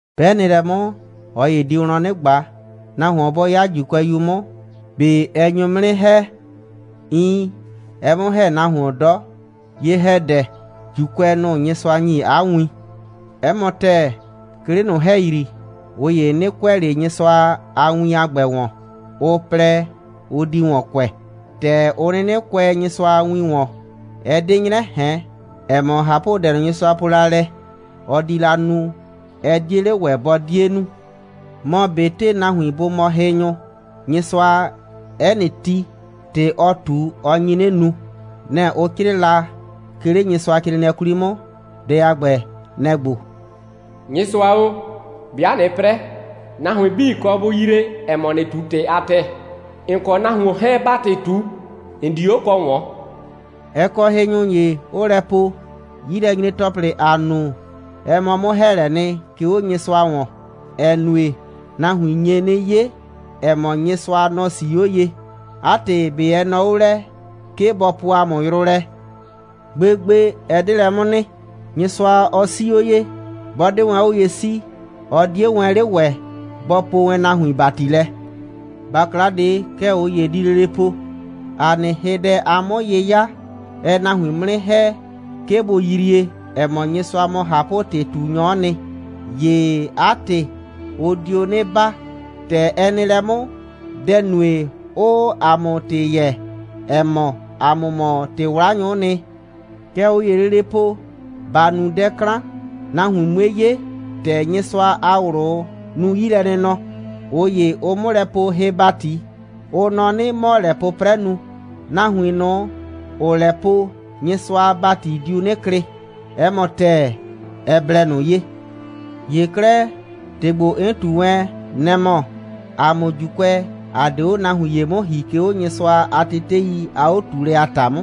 'Bɛ nɩ lɛ 'mʋ, ꞊ɔ ‑ye di wlɔn 'nɩ ꞊gba: «Nahuon, bɔ 'ya ‑Juukʋɛyu 'mʋ, ꞊be ɛ nyo 'mʋ 'nɩ ‑hɛ?» Iin, ɛɛ 'mʋ ‑hɛ nahuon 'dɔ. Ye‑hɛdɛ, ‑Juukʋɛ, nʋ‑ Nyɩsʋa ‑nyi 'a win. 'Ɛ mɔ ‑tɛɛ, 'ke 'le ꞊nʋ ‑hɛyri, ꞊ʋ ‑ye 'nɩ kʋɛ ꞊le Nyɩsʋa a win a ‑gbɛ ‑wɔn, ʋ plɛ, ʋ di ‑wɔn kʋɛ. ‑Tɛ ʋ 'nɩnɩ kʋɛ Nyɩsʋa a win ‑wɔn, ɛ 'de 'nyrɛ ꞊hɛn, ‑ɛ mɔ, ꞊hapʋdɛ ꞊nʋ, Nyɩsʋa po la lɛ, ɔ di la nu, ɛ 'die 'le ‑wɛ bɔ 'die nu. Mɔ, ꞊betɩ nahuin 'bii bʋ mɔ hɩnyʋ, Nyɩsʋa, 'ɛ nɩ ti, ‑tɩ, ɔ ꞊tu, ɔ nyi 'nɩ nu. Nɛ‑ ʋ 'crɩɩ la 'ke, 'le Nyɩsʋacrɩɩnɩɛ 'kwli 'mʋ. Dɛ a ‑gbɛ, nɛ‑ ‑gbo: «Nyɩsʋa o, 'bɩa ꞊nɩɩ 'prɛ, nahuin 'bii kɔ bʋ yrie, ‑ɛ mɔ, ‑nɩɩ ꞊tu ‑tɩ a ‑tɛɛ. ‑N kɔ nahuon 'hɛɛn, 'baa ‑tɩ ꞊tu, ‑n di 'o kɔ ꞊wɔn.» Ɛ kɔ hɩnyʋ ‑ye, 'ʋʋ lɛ po: «'Yilɛnyre‑tɔplɩ, ‑aa nu, ɛ mɔ 'mʋ‑hɛɛlɛɛ nɩ, 'ke 'o Nyɩsʋa ‑wɔn, ‑ɛ nue, nahuin nye 'nɩ 'ye, ‑ɛ mɔ, Nyɩsʋa, nɔ‑ 'sii 'o ye. 'A ‑tɩ, ꞊be ɛ nɔ 'o lɛ, 'ke bɔ poo ‑a mʋ yrʋ lɛ?» Gbegbe, ɛ 'de lɛ 'mʋ nɩ. Nyɩsʋa, ɔ 'sii 'o ye. 'Bɔ 'de wɛn 'o ye 'sii, ɔ 'die wɛn 'le ‑wɛ bɔ poo wɛn nahuin ‑bati lɛ. ‑Bakla ꞊de, kɛ ꞊ʋ ‑ye di lele po: «‑A nɩ hɩdɛ a 'mʋ'yɩya, ɛɛ nahuin 'mʋ 'nɩ ‑hɛ, 'ke bʋ yrie, ‑ɛ mɔ, Nyɩsʋa mɔ ꞊hapʋ‑tɩ꞊tunyɔ'ɔ nɩ. ‑Ye 'a ‑tɩ, ʋ dio 'nɩ baa. ‑Tɛ ɛ nɩ lɛ 'mʋ, dɛ‑ nue, 'ʋʋ ‑a mʋ ‑tɩ yɛɛ, ‑ɛ mɔ, ‑a mʋ mɔ ‑tɩ'wlanyʋ'ʋ nɩ.» Kɛ ꞊ʋ ‑yee lele po: «‑Ba nu dɛ 'klan, nahuin 'mue 'ye, ‑tɛ Nyɩsʋa a ꞊wlʋ nu 'yilɛnɩnɔ.» ꞊Ʋ ‑ye, ʋʋ 'mʋ lɛ poo hɩ‑bati, ʋ nɔ 'nɩ, 'mɔ‑ɔ lɛ 'pʋprɛ nu. Nahuin ꞊nʋ, ‑ʋʋ lɛ po, Nyɩsʋa a ‑bati diu 'nɩ klɩ. 'Ɛ mɔ ‑tɛɛ, ɛ blɛ ꞊nʋ ye. ‑Ye 'klɛɛ, ‑tɩ ‑gbo, 'n ꞊tu wɛn, nɛ‑ mɔ, ‑a mʋ ‑Juukʋɛ, ‑a 'de 'o nahuin ‑ye 'mʋ ‑hi, 'ke 'o Nyɩsʋa a tetei a 'o꞊tuulɛ a ‑ta 'mʋ.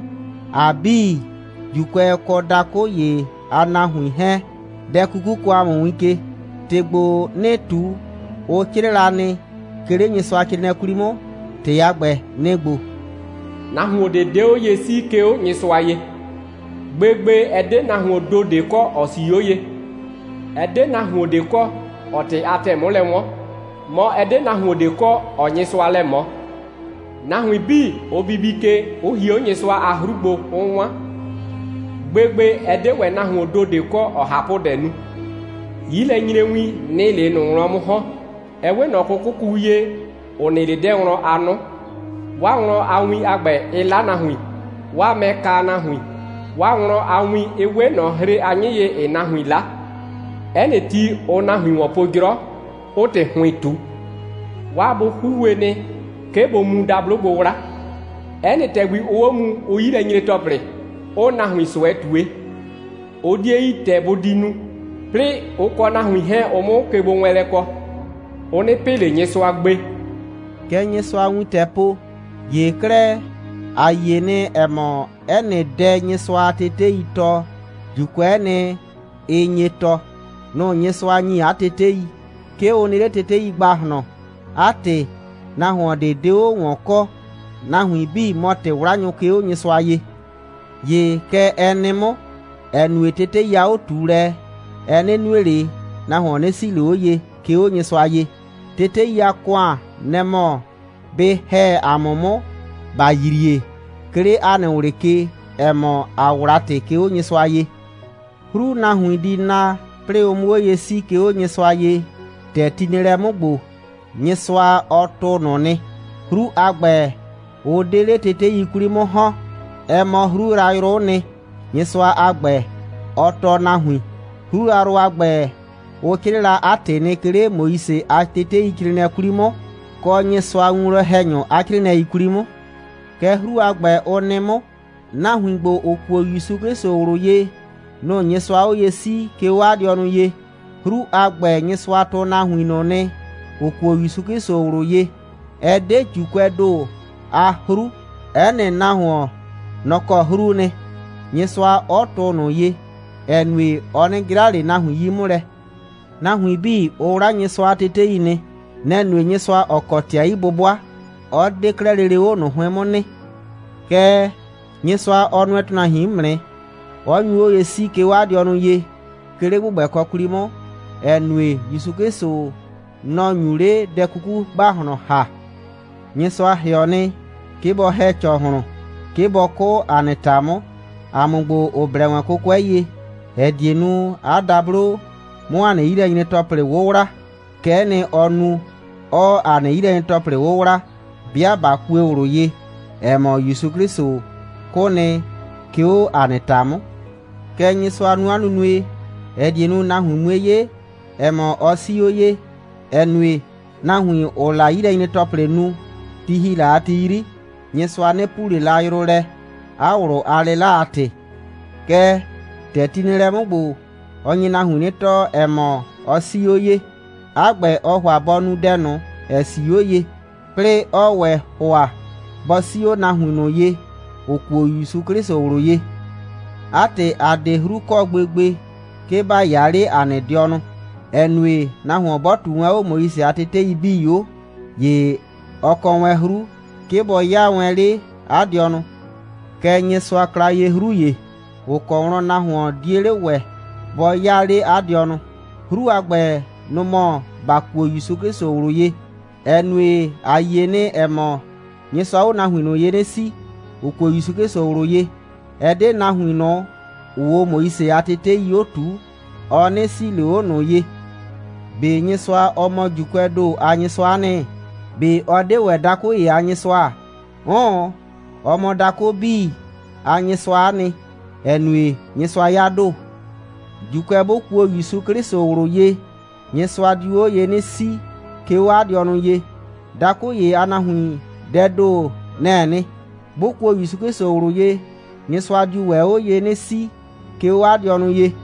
‑A 'bii, ‑Juukʋɛ kɔ dakʋ ‑ye a nahuin 'hɛɛn, dɛ 'kuku kɔɔ ‑a mʋ win ke. ‑Tɩ ‑gbo, 'nɩɩ ꞊tu, ʋ 'crɩɩ la nɩ, 'ke 'le Nyɩsʋacrɩɩnɩɛ 'kwli 'mʋ. ‑Tɩ a ‑gbɛ, nɩ‑ ‑gbo: «Nahuon ꞊de 'de 'o ye 'sii, 'ke 'o Nyɩsʋa ye. Gbegbe, ɛ 'de nahuoon ‑do ꞊de kɔ, ‑ɔ 'sii 'o ye. Ɛ 'de nahuon ꞊de kɔ, ‑ɔɔ ‑tɩ a ‑tɛɛ 'mʋ lɛ 'wɔn, mɔ, ɛ 'de nahuon ꞊de kɔ, ‑ɔɔ Nyɩsʋa lɛ ꞊mɔ. Nahuin 'bii, ʋ bibi ke, 'ʋ hie 'o Nyɩsʋa a 'hru gbo, 'ʋ 'wan. Gbegbe, ɛ 'de ‑wɛ nahuoon ‑do ꞊de kɔ, ‑ɔɔ ꞊hapʋdɛ nu. 'Yilɛnyrewin, nɩ‑ɩ 'le ꞊nʋ wlɔn 'mʋ ‑hɔn, ɛ 'we ꞊nɔ 'kʋkʋku ye, ‑ʋ nɩ 'le 'dɛɛ wlɔn a 'nʋ. 'Waa wlɔn a win a ‑gbɛ, ɩɩ 'la nahuin. 'Waa mɛɛ kaa nahuin. 'Waa wlɔn a win, ɩ 'we ꞊nɔ hre a 'nyɩ ye, ‑ɩɩ nahuin 'la. 'Ɛ nɩ ti, ʋʋ nahuin ‑wɔn po 'jrɔ, 'ʋʋ ‑tɩ ‑hʋɩn ꞊tu. 'Waa bʋ 'huhue nɩ, 'ke bʋ mu dablo gbo 'wla. 'Ɛ nɩ ‑tɛgbi, ʋʋ 'o mu, ʋʋ 'yi lɛ nyre ‑tɔplɩ, 'ʋʋ nahuin ꞊sʋɛ ꞊tue. Ʋ 'die yi, ‑tɛ bʋ di nu, 'plɩɩ ʋ kɔ nahuin 'hɛɛn, ʋ 'mʋ kegbowɛɛnlɛ kɔ. Ʋ 'nɩ pɩ ꞊le Nyɩsʋa gbe.» Kɛ Nyɩsʋa a wintɛɛ po. ‑Ye 'klɛɛ, ‑a yie nɩ, ‑ɛ mɔ, 'ɛ nɩ dɛ, Nyɩsʋa a teteii tɔɔ, ‑Juukʋɛ'ɛ nɩ, ɩ nye tɔɔ. Nʋ‑ Nyɩsʋa ‑nyi 'a tetei. 'Ke ʋ nɩ 'le tetei ‑gbahlɔn. 'A ‑tɩ, nahuon ꞊de 'de 'o ꞊wɔn kɔ. Nahuin 'bii mɔ ‑tɩ'wlanyʋ, 'ke 'o Nyɩsʋa ye. ‑Ye kɛ ɛ nɩ 'mʋ, ‑ɛ nue, tetei a 'o꞊tuulɛ, ɛ 'nɩ nue ꞊le, nahuon 'nɩ 'sii ꞊le 'o ye, 'ke 'o Nyɩsʋa ye. Tetei a ‑kʋan, nɛ‑ mɔ bɩ ‑hɛ ‑a mʋ 'mʋ, ‑ba yrie, 'ke 'le ‑a nɩ ꞊wlɩ ke, ‑ɛ mɔ, ‑a 'wla ‑tɩ, 'ke 'o Nyɩsʋa ye. 'Hru, nahuin di na, 'plɩɩ ʋ 'mʋ 'o ye 'sii, 'ke 'o Nyɩsʋa ye, ‑tɛ ti nɩ lɛ 'mʋ ‑gbo, Nyɩsʋa, ɔ tʋʋ ꞊nʋ nɩ. 'Hru a ‑gbɛ, ʋ 'de 'le tetei 'kwli 'mʋ ‑hɔn. Ɛ mɔ 'hru yrayrʋ'ʋ nɩ, Nyɩsʋa a ‑gbɛ, ɔ tɔɔ nahuin. 'Hru yrayrʋ a ‑gbɛ, ʋ 'crɩɩ la 'a ‑tɩ nɩ, 'ke 'le Moise a teteicrɩɩnɩɛ 'kwli 'mʋ, kɔ Nyɩsʋa a winwlɔn‑hɛnyʋ a 'crɩɩnɩɛi 'kwli 'mʋ. Kɛ 'hru a ‑gbɛ, ʋ nɩ 'mʋ: Nahuin ‑gbo, ‑ʋ kuo ‑Yusu 'Klɩsʋ ꞊wlʋ ye, nʋ‑ Nyɩsʋaa 'o ye 'sii, 'ke 'o 'a dɩɔnʋ ye. 'Hru a ‑gbɛ, Nyɩsʋa tʋʋ nahuin ꞊nʋ nɩ, ‑ʋ kuo ‑Yusu 'Klɩsʋ ꞊wlʋ ye. Ɛ 'de ‑Juukʋɛɛ ‑do a 'hru, 'ɛ nɩ nahuon, nɔ‑ kɔ 'hruu nɩ, Nyɩsʋa 'ɔ tʋʋ ꞊nʋ ye, ‑ɛ nue, ɔ 'nɩ 'jra ꞊le nahuin 'yi 'mʋ lɛ. Nahuin 'bii, ʋ 'wla Nyɩsʋa a tetei nɩ. Nɛ‑ nue, Nyɩsʋa, ‑ɔ kɔ ‑tɩ a 'yi'bʋbʋa, 'ɔ 'de 'klɛɛ lele 'o ꞊nʋ 'hʋɩn 'mʋ nɩ. Kɛɛ, Nyɩsʋa, ɔ nʋɛ ‑tʋnahuin 'mʋ nɩ, 'ɔ nyu 'o ye 'sii, 'ke 'o 'a dɩɔnʋ ye, 'ke 'le ‑gbʋgbɛkɔ 'kwli 'mʋ, ‑ɛ nue, ‑Yusu 'Klɩsʋ, nɔ‑ nyu 'le dɛ 'kuku ‑gbahlɔn ‑ha. Nyɩsʋa ‑hɩɔ nɩ, 'ke bɔ ‑hɛ ‑cɔhlʋn, 'ke bɔ 'kʋ ‑a nɩ ‑ta 'mʋ, ‑a mʋ ‑gbo, ‑ʋ blɛ wɛn 'kʋkʋɛ ye, ‑ɛ die nu, 'a dablo 'mʋ ‑a nɩ 'yilɛnyre‑tɔplɩ 'wʋwla. Kɛ'ɛ nɩ, ɔɔ nu, 'ɔɔ ‑a nɩ 'yilɛnyre‑tɔplɩ 'wʋwla, 'bɩa ꞊ba kue ꞊wlʋ ye, ‑ɛ mɔ, ‑Yusu 'Klɩsʋ 'kʋ nɩ, 'ke 'o ‑a nɩ ‑ta 'mʋ. Kɛ Nyɩsʋaa 'a nunue nu, ‑ɛ die nu, nahuin 'mue 'ye, ‑ɛ mɔ, ɔ 'sii 'o ye, ‑ɛ nue, nahuin, ‑ʋʋ la 'yilɛnyre‑tɔplɩ nu, ti ‑hi la a ti 'yri, Nyɩsʋa 'nɩ puu ꞊le la yrʋ lɛ, 'a ꞊wlʋ a 'lɩla a ‑tɩ. Kɛɛ, ‑tɛ ti nɩ lɛ 'mʋ ‑gbo, ɔ nye nahuin 'nɩ tɔɔ, ‑ɛ mɔ, ɔ 'sii 'o ye. 'A ‑gbɛ, ɔɔ ‑hʋa bɔ nu dɛ ꞊nʋ, ‑ɛ 'sii 'o ye, 'plɩɩ 'ɔɔ ‑wɛ ‑hʋa bɔ 'sii 'o nahuin ꞊nʋ ye, ‑ʋ kuo ‑Yusu 'Klɩsʋ ꞊wlʋ ye. 'A ‑tɩ, ‑a 'de 'hru kɔ gbegbe, 'ke ‑ba 'yaa 'le ‑a nɩ dɩɔnʋ, ‑ɛ nue, nahuon 'bɔ ꞊tuu wɛn 'o Moise a tetei 'bii 'o, ‑ye ɔ kɔ wɛn 'hru, 'ke bɔ 'yaa wɛn 'le 'a dɩɔnʋ. Kɛɛ, Nyɩsʋa kla ye 'hru ‑ye, ‑ʋ kɔ wlɔn nahuon 'die 'le ‑wɛ bɔ 'yaa 'le 'a dɩɔnʋ. 'Hru a ‑gbɛ, nʋ‑ mɔ ‑ba kuo ‑Yusu 'Klɩsʋ ꞊wlʋ ye, ‑ɛ nue, ‑a yie nɩ, ‑ɛ mɔ, Nyɩsʋaa 'o nahuin ꞊nʋ ye 'nɩ 'sii, ‑ʋ kuo ‑Yusu 'Klɩsʋ ꞊wlʋ ye, ɛ 'de nahuin ꞊nʋ, ‑ʋʋ 'o Moise a tetei 'o ꞊tuu, ɔ 'nɩ 'sii ꞊le 'o ꞊nʋ ye. ꞊Be Nyɩsʋa, ɔ mɔ ‑Juukʋɛɛ ‑do a Nyɩsʋa'a nɩ? ꞊Be ɔ 'de ‑wɛ dakʋ ‑ye a Nyɩsʋa? 'Ʋʋn, ɔ mɔ dakʋ 'bii a Nyɩsʋa'a nɩ, ‑ɛ nue, Nyɩsʋa 'ya ‑do. ‑Juukʋɛ 'bʋ kuo ‑Yusu 'Klɩsʋ ꞊wlʋ ye, Nyɩsʋa diu 'o ye 'nɩ 'sii, 'ke 'o 'a dɩɔnʋ ye. Dakʋ ‑ye a nahuin, dɛɛ ‑do, nɛ‑ɛ nɩ. 'Bʋ kuo ‑Yusu 'Klɩsʋ ꞊wlʋ ye, Nyɩsʋa diu ‑wɛ 'o ye 'nɩ 'sii, 'ke 'o 'a dɩɔnʋ ye.